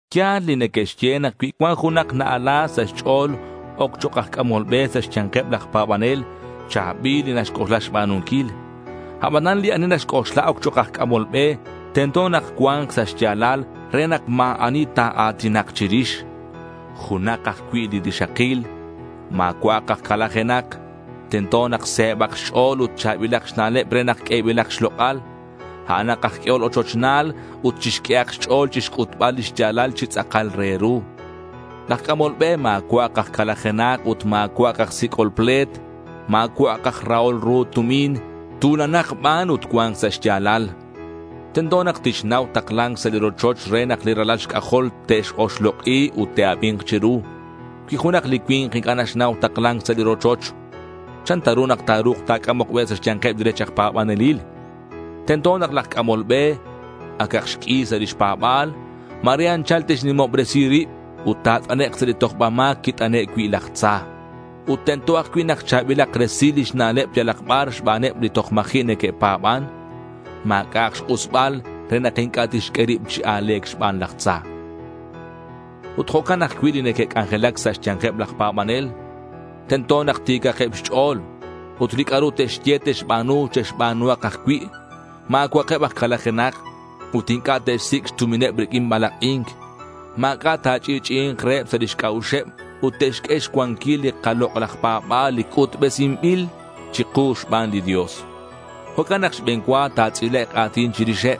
Ya̱l li neque'xye nak cui cuan junak na-ala sa' xch'o̱l oc chok' aj c'amol be sa' xya̱nkeb laj pa̱banel, cha̱bil li naxc'oxla xba̱nunquil. Abanan li ani naxc'oxla oc chok' aj c'amol be, tento nak cua̱nk sa' xya̱lal re nak ma̱ ani ta̱a̱tinak chirix. Junak ajcui' li rixakil. Ma̱cua'ak aj calajenak. Tento nak se̱bak xch'o̱l ut cha̱bilak xna'leb re nak q'uebilak xlok'al. A'anak aj q'uehol ochochna̱l ut chixq'uehak xch'o̱l chixc'utbal lix ya̱lal chi tz'akal re ru. Laj c'amol be ma̱cua'ak aj calajenak ut ma̱cua'ak aj sic'ol ple̱t. Ma̱cua'ak aj rahol ru tumin. Tu̱lanak ban ut cua̱nk sa' xya̱lal. Tento nak tixnau takla̱nc sa' li rochoch re nak li ralal xc'ajol te'x-oxlok'i ut te'abi̱nk chiru. Cui junak li cui̱nk inc'a' naxnau takla̱nc sa' li rochoch, ¿chan ta ru nak ta̱ru̱k ta̱c'amok be sa' xya̱nkeb li rech aj pa̱banelil? Tento nak laj c'amol be acak xq'ui sa' lix pa̱ba̱l. Ma̱re anchal tixnimobresi rib ut ta̱t'anek' sa' li tojbal ma̱c quit'ane' cui' laj tza. Ut tento ajcui' nak cha̱bilak resil lix na'leb yalak bar xbaneb li toj ma̱ji' neque'pa̱ban. Ma̱c'a'ak xk'usbal re nak inc'a' tixq'ue rib chi a̱le̱c xban laj tza. Ut jo'can ajcui' li neque'c'anjelac sa' xya̱nkeb laj pa̱banel. Tento nak ti̱cakeb xch'o̱l. Ut li c'a'ru te'xye te'xba̱nu, che'xba̱nuhak ajcui'. Ma̱cua'akeb aj calajenak. Ut inc'a' te'xsic' xtumineb riq'uin balak'i̱nc. Ma̱c'a' ta̱ch'i'ch'i'i̱nk reheb sa' lix c'a'uxeb ut te'xq'ue xcuanquil li kalok'laj pa̱ba̱l li c'utbesinbil chiku xban li Dios. Jo'can nak xbe̱n cua, ta̱tz'ilek' a̱tin chirixeb.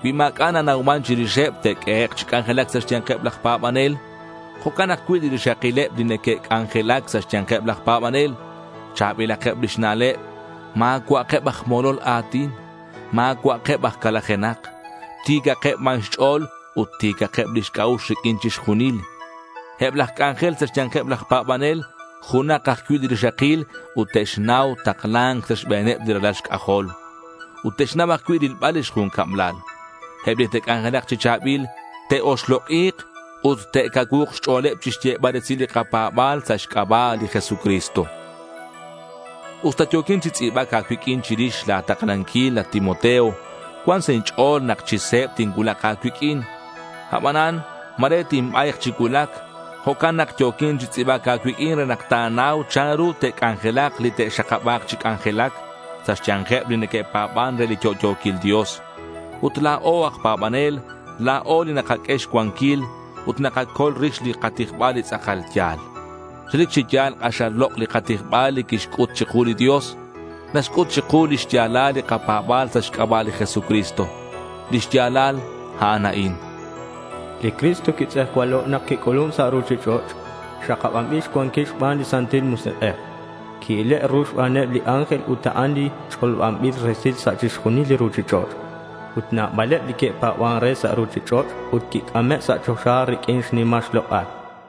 Cui ma̱c'a' nanauman chirixeb, te'q'uehek' chi c'anjelac sa' xya̱nkeb laj pa̱banel. Jo'can ajcui' li rixakileb li neque'c'anjelac sa' xya̱nkeb laj pa̱banel. Cha̱bilakeb lix na'leb. Ma̱cua'akeb aj molol a̱tin. Ma̱cua'akeb aj calajenak. Ti̱cakeb ban xch'o̱l ut ti̱cakeb lix c'a'ux riq'uin chixjunil. Eb laj c'anjel sa' xya̱nkeb laj pa̱banel, junak ajcui' li rixakil ut te'xnau takla̱nc sa' xbe̱neb li ralal xc'ajol. Ut te'xnau ajcui' rilbal lix jun cablal. Eb li te'c'anjelak chi cha̱bil, te'oxlok'i̱k ut te'cacuu̱k xch'o̱leb chixyebal resil li kapa̱ba̱l sa' xc'aba' li Jesucristo. Usta yo̱quin chi tz'i̱bac a̱cuiq'uin chirix la̱ taklanquil, at Timoteo, cuan sa' inch'o̱l nak chi se̱b tincuulak a̱cuiq'uin. Abanan ma̱re tinba̱yk chi cuulac. Jo'can nak yo̱quin chi tz'i̱bac a̱cuiq'uin re nak ta̱nau chanru te'c'anjelak li te'xakaba̱k chi c'anjelac sa' xya̱nkeb li neque'pa̱ban re li yo'yo̱quil Dios. Ut la̱o aj pa̱banel, la̱o li nakaq'ue xcuanquil ut nakacol rix li katijbal li tz'akal ya̱l. Relic chi ya̱l k'axal lok' li katijbal li quixc'ut chiku li Dios. Naxc'ut chiku li xya̱lal li kapa̱ba̱l sa' xc'aba' li Jesucristo. Li xya̱lal a'an a'in: Li Cristo quitz'ejcualo' nak quic'ulun sa' ruchich'och'. Xakabanbil xcuanquil xban li Santil Musik'ej. Qui-ile' ru xbaneb li ángel. Ut a'an li ch'olobanbil resil sa' chixjunil li ruchich'och'. Ut nabaleb li que'pa̱ban re sa' ruchich'och'. Ut quic'ame' sa' choxa riq'uin xnimal xlok'al.